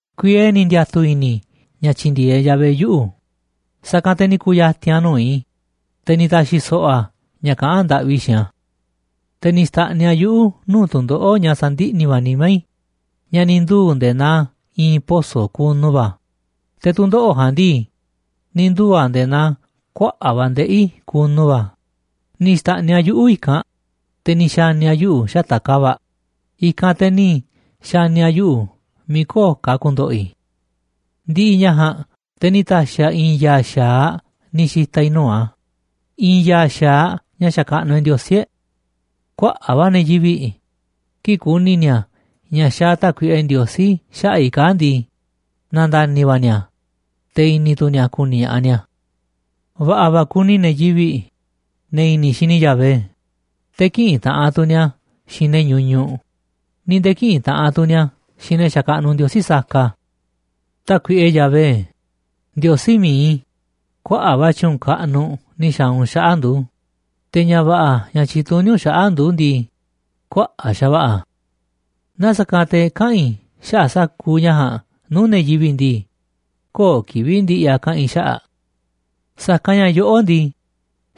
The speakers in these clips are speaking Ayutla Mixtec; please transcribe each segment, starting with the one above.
Kuiee ni̱ ndiatu̱ i̱ni̱ i̱ ña̱ tyi̱ndi̱e̱eꞌ Yahvé yuꞌu̱, sa̱kanꞌ te̱ ni̱ ku̱ya̱ti̱n a̱ nuu̱ꞌ i̱, te̱ ni̱ ta̱xi̱ so̱ꞌo̱ a̱ ña̱ kaꞌán ndaꞌvi i̱ xiinꞌ a̱. Te̱ ni̱ xta̱ꞌniꞌ a̱ yuꞌu̱ nuu̱ꞌ tu̱ndoꞌo̱ꞌ ña̱ sandiꞌni̱ va̱ nimá i̱ ña̱ ni̱ nduu̱ nde̱e̱ naa i̱i̱n poso̱ kunu va̱, te̱ tu̱ndoꞌo̱ꞌ ja̱a̱nꞌ ndii, ni̱ nduu̱ a̱ nde̱e̱ naa kuaꞌa̱ꞌ va̱ ndeꞌi̱ kunu va̱, ni̱ xta̱ꞌniꞌ a̱ yuꞌu̱ i̱kanꞌ, te̱ ni̱ xa̱ni̱ a̱ yuꞌu̱ xata̱ꞌ ka̱va̱ꞌ, i̱kanꞌ te̱ ni̱ xa̱ni̱ a̱ yuꞌu̱ miiꞌ köo̱ꞌ ka̱ a̱ ku̱ndo̱ꞌo̱ i̱. Ndi̱ꞌi̱ ña̱ ja̱a̱nꞌ te̱ ni̱ ta̱xi̱ a̱ i̱i̱n ya̱a̱ xa̱aꞌ ni̱ xi̱ta̱ i̱ nuu̱ꞌ a̱, i̱i̱n ya̱a̱ xa̱aꞌ ña̱ xakaꞌnuꞌ e̱ꞌ Ndiosí e̱ꞌ. Kuaꞌa̱ꞌ va̱ ne̱ yivi̱ꞌ, kii̱ꞌ ku̱ni̱ ni̱a̱ ña̱ xa̱a̱ Tákuiꞌe Ndiosí xaꞌa̱ꞌ i̱ kaa̱ꞌ ndii, na̱nda̱ni̱ va̱ ni̱a̱, te̱ i̱ni̱ tu̱ ni̱a̱ ku̱ni̱ ña̱ꞌaꞌ ni̱a̱. Va̱ꞌa̱ va̱ kuni ne̱ yivi̱ꞌ, ne̱ i̱ni̱ xini Yahvé, te̱ kïꞌinꞌ taꞌanꞌ ni̱a̱ xiinꞌ ne̱ ñuñuꞌ, ni̱ nde̱e̱ kïꞌinꞌ taꞌanꞌ tu̱ ni̱a̱ xiinꞌ ne̱ xakaꞌnuꞌ ndiosí saka. Tákuiꞌe Yahvé, Ndiosí mi̱iꞌ i̱, kuaꞌa̱ꞌ va̱ tyu̱u̱n kaꞌnuꞌ ni̱ xa̱a̱ u̱nꞌ xaꞌa̱ꞌ ndu̱, te̱ ña̱ va̱ꞌa̱ ña̱ tyituní u̱nꞌ xaꞌa̱ꞌ ndu̱ ndii, kuaꞌa̱ꞌ xa̱va̱ꞌa̱ a̱. Naaꞌ sa̱kanꞌ te̱ kaꞌa̱n i̱ xaꞌa̱ꞌ sa̱kuuꞌ ña̱ ja̱a̱nꞌ nuu̱ꞌ ne̱ yivi̱ꞌ ndii, köo̱ꞌ kivi̱ꞌ ndi̱ꞌi̱ a̱ kaꞌa̱n i̱ xaꞌa̱ꞌ. Sa̱kanꞌ ña̱ yoꞌó ndii,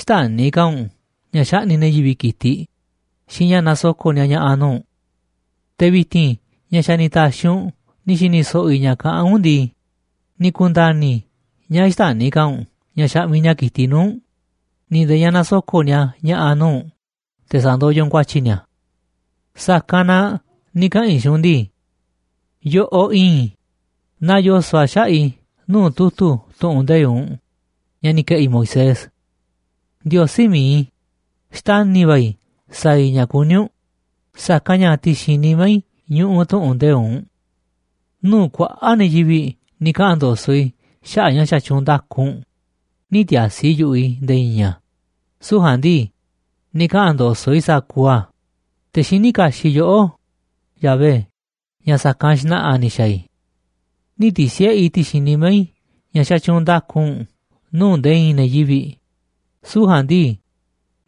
xtäni̱ ka̱ u̱nꞌ ña̱ xaꞌni̱ꞌ ne̱ yivi̱ꞌ ki̱tiꞌ xiinꞌ ña̱ nasoko̱ꞌ ni̱a̱ ña̱ꞌa̱ nuu̱ꞌ u̱nꞌ. Te̱ vi̱ti̱n ña̱ xa̱ ni̱ ta̱xi̱ u̱nꞌ ni̱ xi̱ni̱ so̱ꞌo̱ i̱ ña̱ kaꞌán u̱nꞌ ndii, ni̱ ku̱nda̱ni̱ i̱ ña̱ xtäni̱ ka̱ u̱nꞌ ña̱ xaꞌmiꞌ ni̱a̱ ki̱tiꞌ nuu̱ꞌ u̱nꞌ, ni̱ nde̱e̱ ña̱ nasoko̱ꞌ ni̱a̱ ña̱ꞌa̱ nuu̱ꞌ u̱nꞌ te̱ sa̱ndoyoꞌ u̱nꞌ ku̱a̱tyi̱ ni̱a̱. Sa̱kanꞌ na ni̱ kaꞌa̱n i̱ xiinꞌ u̱nꞌ ndii: “Yoꞌoꞌ iinꞌ i̱, naa yoso̱ꞌ a̱ xaꞌa̱ꞌ i̱ nuu̱ꞌ tu̱tu̱ tu̱ꞌu̱n nde̱iꞌ u̱nꞌ ña̱ ni̱ ke̱ꞌi̱ Moisés. Ndiosí mi̱iꞌ i̱, xtani̱ va̱ i̱ sa̱a̱ i̱ ña̱ kuní u̱nꞌ, sa̱kanꞌ ña̱ ti̱xi̱n nimá i̱ ñuꞌuꞌ tu̱ꞌu̱n nde̱iꞌ u̱nꞌ.” Nuu̱ꞌ kuaꞌa̱ꞌ ne̱ yivi̱ꞌ ni̱ kaꞌa̱n ndo̱so̱ꞌ i̱ xaꞌa̱ꞌ ña̱ xatyuunꞌ nda̱ku u̱nꞌ, nï̱ ti̱a̱si̱ yu̱ꞌuꞌ i̱ nde̱e̱ i̱i̱n a̱, süu̱ꞌ ja̱a̱nꞌ ndii, ni̱ kaꞌa̱n ndo̱so̱ꞌ i̱ sa̱kuuꞌ a̱, te̱ xiní kaxiꞌ yoꞌó, Yahvé, ña̱ sa̱kanꞌ xna̱ꞌa̱ ni̱ xa̱a̱ i̱. Nï̱ ti̱si̱ꞌe i̱ ti̱xi̱n nimá i̱ ña̱ xatyuunꞌ nda̱ku u̱nꞌ nuu̱ꞌ nde̱e̱ i̱i̱n ne̱ yivi̱ꞌ, süu̱ꞌ ja̱a̱nꞌ ndii,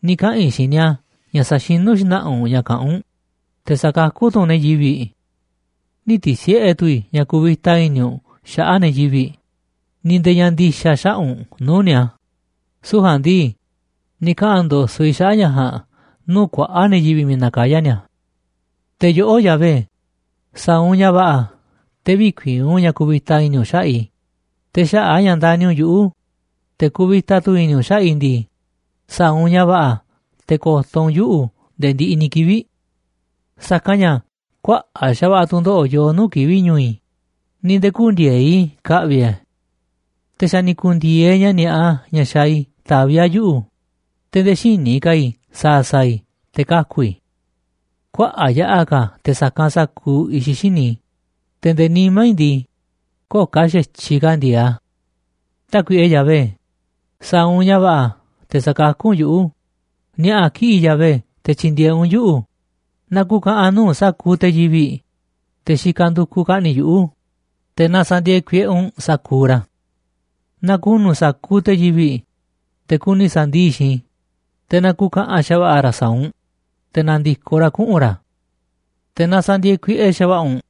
ni̱ kaꞌa̱n i̱ xiinꞌ ni̱a̱ ña̱ saxinú xna̱ꞌa̱ u̱nꞌ ña̱ kaꞌán u̱nꞌ, te̱ sa̱kakú tu̱ u̱nꞌ ne̱ yivi̱. Nï̱ ti̱si̱ꞌe tu̱ i̱ ña̱ kuvita i̱ni̱ u̱nꞌ xaꞌa̱ꞌ ne̱ yivi̱ꞌ, ni̱ nde̱e̱ ña̱ ndi̱xa̱ xaꞌa̱ꞌ u̱nꞌ nuu̱ꞌ ni̱a̱, süu̱ꞌ ja̱a̱nꞌ ndii, ni̱ kaꞌa̱n ndo̱so̱ꞌ i̱ xaꞌa̱ꞌ ña̱ ja̱a̱nꞌ nuu̱ꞌ kuaꞌa̱ꞌ ne̱ yivi̱ꞌ miiꞌ nakayá ni̱a̱. Te̱ yoꞌó, Yahvé, sa̱a̱ u̱nꞌ ña̱ va̱ꞌa̱ te̱ vï̱kuii̱n u̱nꞌ ña̱ kuvita i̱ni̱ u̱nꞌ xaꞌa̱ꞌ i̱, te̱ xaꞌa̱ꞌ a̱ ña̱ ndani̱ u̱nꞌ yuꞌu̱, te̱ kuvita tu̱ i̱ni̱ u̱nꞌ xaꞌa̱ꞌ i̱ ndii, sa̱a̱ u̱nꞌ ña̱ va̱ꞌa̱ te̱ ko̱to̱ u̱nꞌ yuꞌu̱ nde̱e̱ ndiꞌiꞌ ni̱ kivi̱ꞌ. Sa̱kanꞌ ña̱ kuaꞌa̱ꞌ xa̱va̱ꞌa̱ tu̱ndoꞌo̱ꞌ yoo nuu̱ꞌ kivi̱ꞌ ñu̱u̱ i̱, ni̱ nde̱e̱ kü̱ndi̱e̱eꞌ i̱ ka̱ꞌvi̱ i̱ a̱. Te̱ xa̱ ni̱ ku̱ndi̱e̱eꞌ ña̱ ni̱a̱ꞌa ña̱ xaaꞌ i̱ taví a̱ yuꞌu̱, te̱ nde̱e̱ xïní ka̱ i̱ sa̱a̱ sa̱a̱ i̱ te̱ kaku̱ i̱. Kuaꞌa̱ꞌ yaꞌa̱ ka̱ a̱ te̱ sa̱kanꞌ sa̱kuuꞌ i̱xiꞌ xíniꞌ i̱, te̱ nde̱e̱ nimá i̱ ndii, köo̱ꞌ ka̱ xa̱tyiꞌ ka̱ ndi̱e̱e̱ꞌ a̱. Tákuiꞌe Yahvé, sa̱a̱ u̱nꞌ ña̱ va̱ꞌa̱ te̱ sa̱kakú u̱nꞌ yuꞌu̱, ni̱a̱ꞌa̱ kiꞌi̱ꞌ Yahvé te̱ tyi̱ndi̱e̱eꞌ u̱nꞌ yuꞌu̱. Na ku̱ka̱ꞌa̱n nuu̱ꞌ sa̱kuuꞌ te̱ yivi̱ꞌ, te̱ xikaꞌ ndukuꞌ ka̱ꞌni̱ꞌ yuꞌu̱, te̱ na sa̱ndi̱e̱e̱ kuiꞌe u̱nꞌ sa̱kuuꞌ ra̱. Na ku̱nu̱ sa̱kuuꞌ te̱ yivi̱ꞌ, te̱ kuni sa̱ndii̱ꞌ xiinꞌ i̱, te̱ na ku̱ka̱ꞌa̱n xa̱va̱ꞌa̱ ra̱ sa̱a̱ u̱nꞌ, te̱ na̱ndi̱koꞌ ra̱ kuꞌu̱n ra̱. Te̱ na sa̱ndi̱e̱e̱ kuiꞌe xa̱va̱ꞌa̱ u̱nꞌ,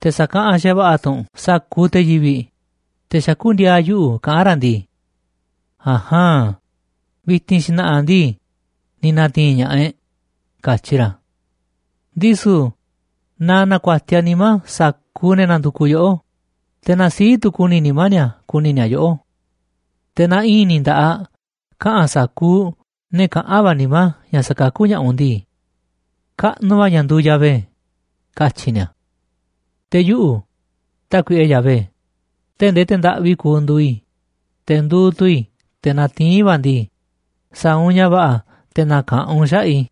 te̱ sa̱kaꞌanꞌ xa̱va̱ꞌa̱ tu̱ u̱nꞌ sa̱kuuꞌ te̱ yivi̱ꞌ, te̱ xakú ndi̱a̱a̱ yuꞌu̱ kaꞌán ra̱ ndii: “A̱jaan, vi̱ti̱n xna̱ꞌa̱ ndii, ni̱ na̱ti̱i̱n ña̱ꞌaꞌ e̱ꞌ”, katyi ra̱. Ndisu̱ na na̱ku̱a̱tiaꞌ nimá sa̱kuuꞌ ne̱ nandukuꞌ yoꞌó, te̱ na sii̱ꞌ tu̱ ku̱ni̱ nimá ni̱a̱ ku̱ni̱ ni̱a̱ yoꞌó. Te̱ na i̱i̱n ni̱ nda̱ꞌaꞌ kaꞌa̱n sa̱kuuꞌ ne̱ kaꞌán va̱ nimá ña̱ sa̱kakú ña̱ꞌaꞌ u̱nꞌ ndii: “Kaꞌnuꞌ va̱ ña̱ nduuꞌ Yahvé”, katyi̱ ni̱a̱. Te̱ yuꞌu̱, Tákuiꞌe Yahvé, tee̱ꞌ ndee te̱ ndaꞌvi kuuꞌ nduuꞌ i̱, te̱ nduuꞌ tu̱ i̱ te̱ natiín va̱ ndii, sa̱a̱ u̱nꞌ ña̱ va̱ꞌa̱ te̱ na̱ka̱ꞌanꞌ u̱nꞌ xaꞌa̱ꞌ i̱.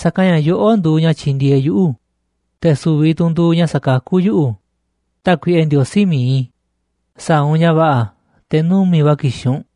Sa̱kanꞌ ña̱ yoꞌó nduuꞌ ña̱ tyindieeꞌ yuꞌu̱, te̱ su̱vi̱ tu̱ u̱nꞌ nduuꞌ ña̱ sakakú yuꞌu̱, Tákuiꞌe Ndiosí mi̱iꞌ i̱, sa̱a̱ u̱nꞌ ña̱ va̱ꞌa̱ te̱ numi̱ꞌ va̱ ki̱xi̱n u̱nꞌ.